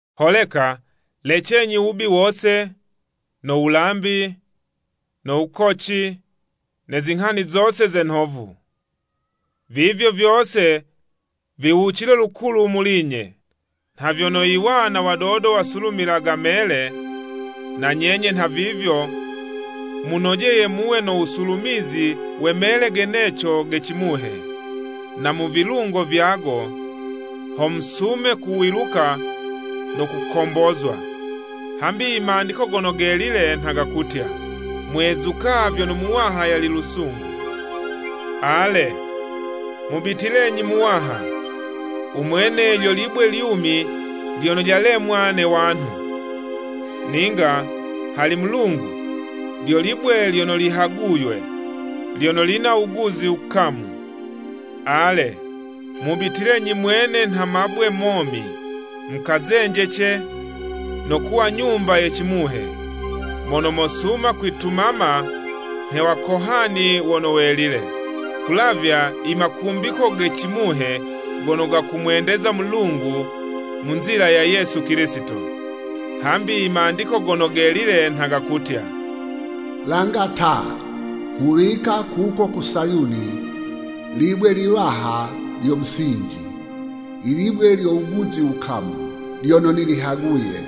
Holeka, lecenyi wubi wose: no wulambi, no wukoci, ne zinghani zose ze nhovu, vivyo vyose viwucile lukulu muli nyenye. Nha vyono iwana wadodo wasulumilaga mele, na nyenye nhavivyo munojeye muwe no wusulumizi we mele geneco ge cimuhe, na mu vilungo vyago, ho musume kuwiluka no kukombozwa. Hambi i Mandiko Gono Gelile, nha gakutya, “Mwezuka vyono Muwaha yali lusungu.” Ale, mubitilenyi Muwaha! Umwene lyo libwe lyumi lyono lyalemwa ne wanhu, ninga hali Mulungu, lyo libwe lyono lihaguywe, lyono lina wuguzi wukamu. Ale mubitilenyi mwene nha mabwe momi, mukazenjece, no kuwa nyumba ye cimuhe, mono mosuma kwitumama nhe wakohani wono welile, ku wulavya i makumbiko ge cimuhe gono gakumwendeza Mulungu mu nzila ya Yesu Kilisito. Hambi i Mandiko Gono Gelile nha gakutya, “Langa ta! Nghuwika kuko ku Sayuni libwe liwaha lyo musinji. Ilibwe lyo wuguzi wukamu, lyono nilihaguye.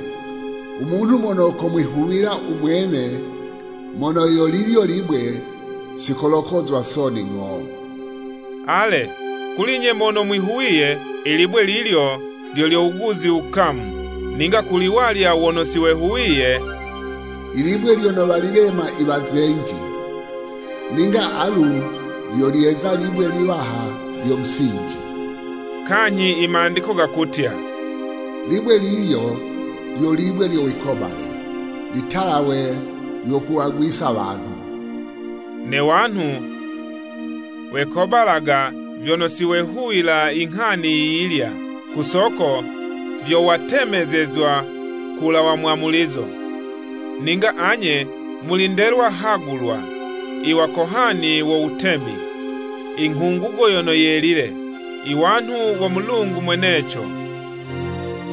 Umunhu mono komwihuwila umwene mono yo lilyo libwe, sikolokozwa soni ng'o.” Ale kuli'nye mono mwihuwiye, ilibwe lilyo lyo lyo wuguzi wukamu, ninga kuli walya wono siwehuwiye, “I libwe lyono walilema iwazenji, ninga alu lyo lyeza libwe liwaha lyo musinji.” Kanyhi i Mandiko gakutya, “Libwe lilyo lyo libwe lyo wikobale, litalawe lyo kuwagwisa wanhu.” Ne wanhu wekobalaga vyono siwehuwila inghani yiyilya. Ku soko vyo watemezezwa ku wulawa mwamulizo. Ninga anye muli ndelwa hagulwa, iwakohani wo Mutemi, inghungugo yono yelile, i wanhu wo Mulungu mweneco,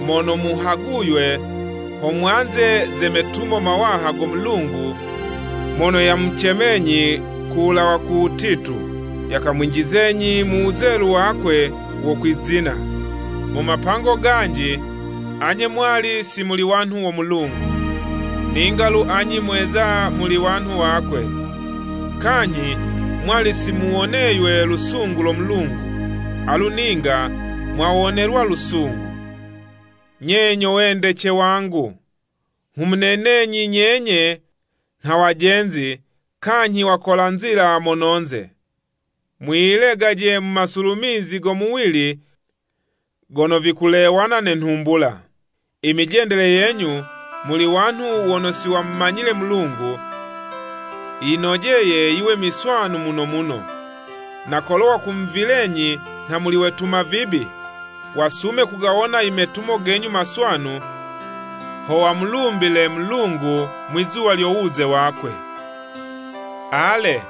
mono muhaguywe ho mwanze ze metumo mawaha go Mulungu mono yamucemenyi kulawa ku wutitu, yakamwinjizenyi mu wuzelu wakwe wo kwizina. Mu mapango ganji, anye mwali si muli wanhu wo Mulungu, ninga'lu anye mweza muli wanhu wakwe, kanyhi mwali si muwoneywe lusungu lo Mulungu, alu ninga mwawonelwa lusungu. Nye nyo wendece wangu, nghumunenenyi nyenye nha wajenzi kanyhi wakola nzila mononze! Mwiyilegaje mu masulumizi go muwili gono vikulewana ne nhumbula. I mijendele yenyu muli wanhu wono siwamumanyile Mulungu, yinojeye yiwe miswanu muno muno, na kolo wakumuvilenyi nha muli wetuma vibi, wasume kugawona i metumo genyu maswanu, ho wamulumbile Mulungu mwizuwa lyo wuze wakwe. Ale,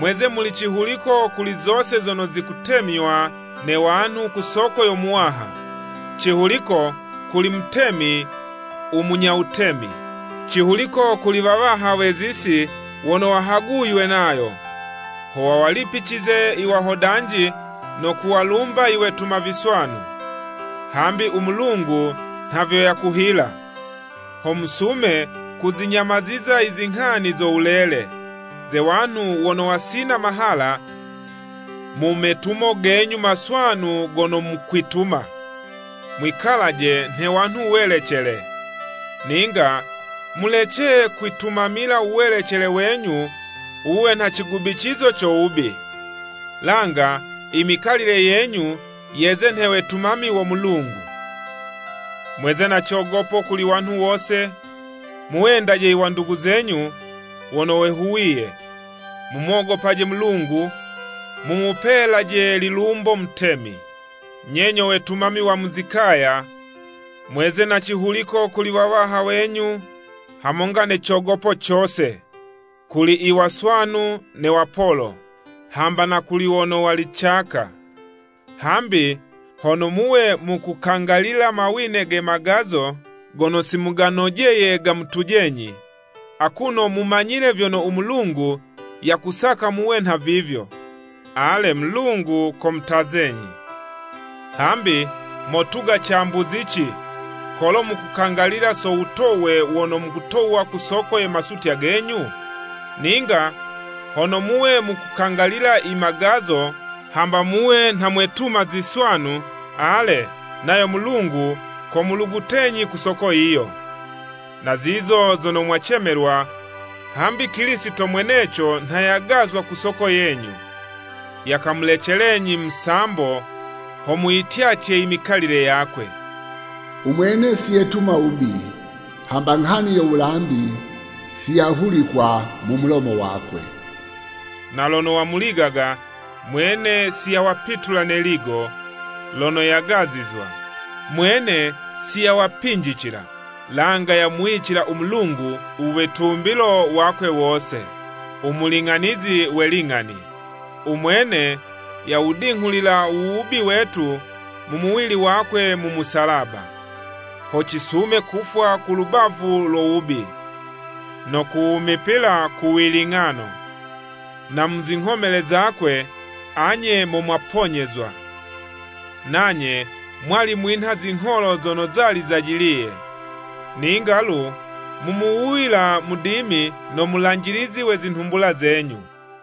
mweze muli cihuliko kuli zose zono zikutemywa ne wanhu ku soko yo Muwaha. Cihuliko kuli mutemi u munya wutemi, cihuliko kuli wawaha we'zisi wono wahaguywe nayo, ho wawalipicize i wahodanji no kuwalumba i wetuma viswanu. Hambi u Mulungu nha vyo yakuhila, ho musume kuzinyamaziza i zinghani zo wulele, ze wanhu wono wasina mahala mu metumo genyu maswanu gono mukwituma. Mwikalaje nhe wanhu welecele, ninga mulece kuwitumamila u welecele wenyu wuwe nha cigubicizo co wubi, langa i mikalile yenyu yeze nhe wetumami wo Mulungu. Mweze na cogopo kuli wanhu wose, mu wendaje i wandugu zenyu wono wehuwiye, mumogopaje Mulungu, mumupelaje lilumbo mutemi. Nye nyo wetumami wa mu zikaya, mweze na cihuliko kuli wawaha wenyu hamonga ne cogopo cose, kuli i waswanu ne wapolo, hamba na kuli wono wali caka. Hambi hono muwe mukukangalila mawine ge magazo gono simuganojeye gamutujenyi, akuno mumanyile vyono u Mulungu yakusaka muwe nha vivyo, ale Mulungu kumutazenyi. Hambi, motuga cambuzici kolo mukukangalila so wutowe wono mukutowa ku soko ye masutya genyu? Ninga hono muwe mukukangalila i magazo, hamba muwe nha mwetuma ziswanu, ale, nayo Mulungu komulugutenyi ku soko yiyo. Na zizo zo mwacemelwa, hambi Kilisito mweneco nha yagazwa ku soko yenyu, yakamulecelenyi musambo, ho muyityatye i mikalile yakwe. Umwene siyetuma wubi, hamba nghani yo wulambi, siyahulikwa mu mulomo wakwe. Na lono wamuligaga, mwene siyawapitula ne'ligo, lono yagazizwa, mwene siyawapinjicila langa yamuwicila u Mulungu u witumbilo wakwe wose, u muling'anizi we ling'ani. U mwene yawudinghulila u wubi wetu mu muwili wakwe mu musalaba, ho cisume kufwa ku lubavu lo wubi, no kuwumipila ku wiling'ano. Na muzinghomele zakwe, anye mo mwaponyezwa. Nanye mwali mwinha zingholo zono zali zajiliye, ninga lu mumuwuyila Mudimi no mulanjilizi we zinhumbula zenyu.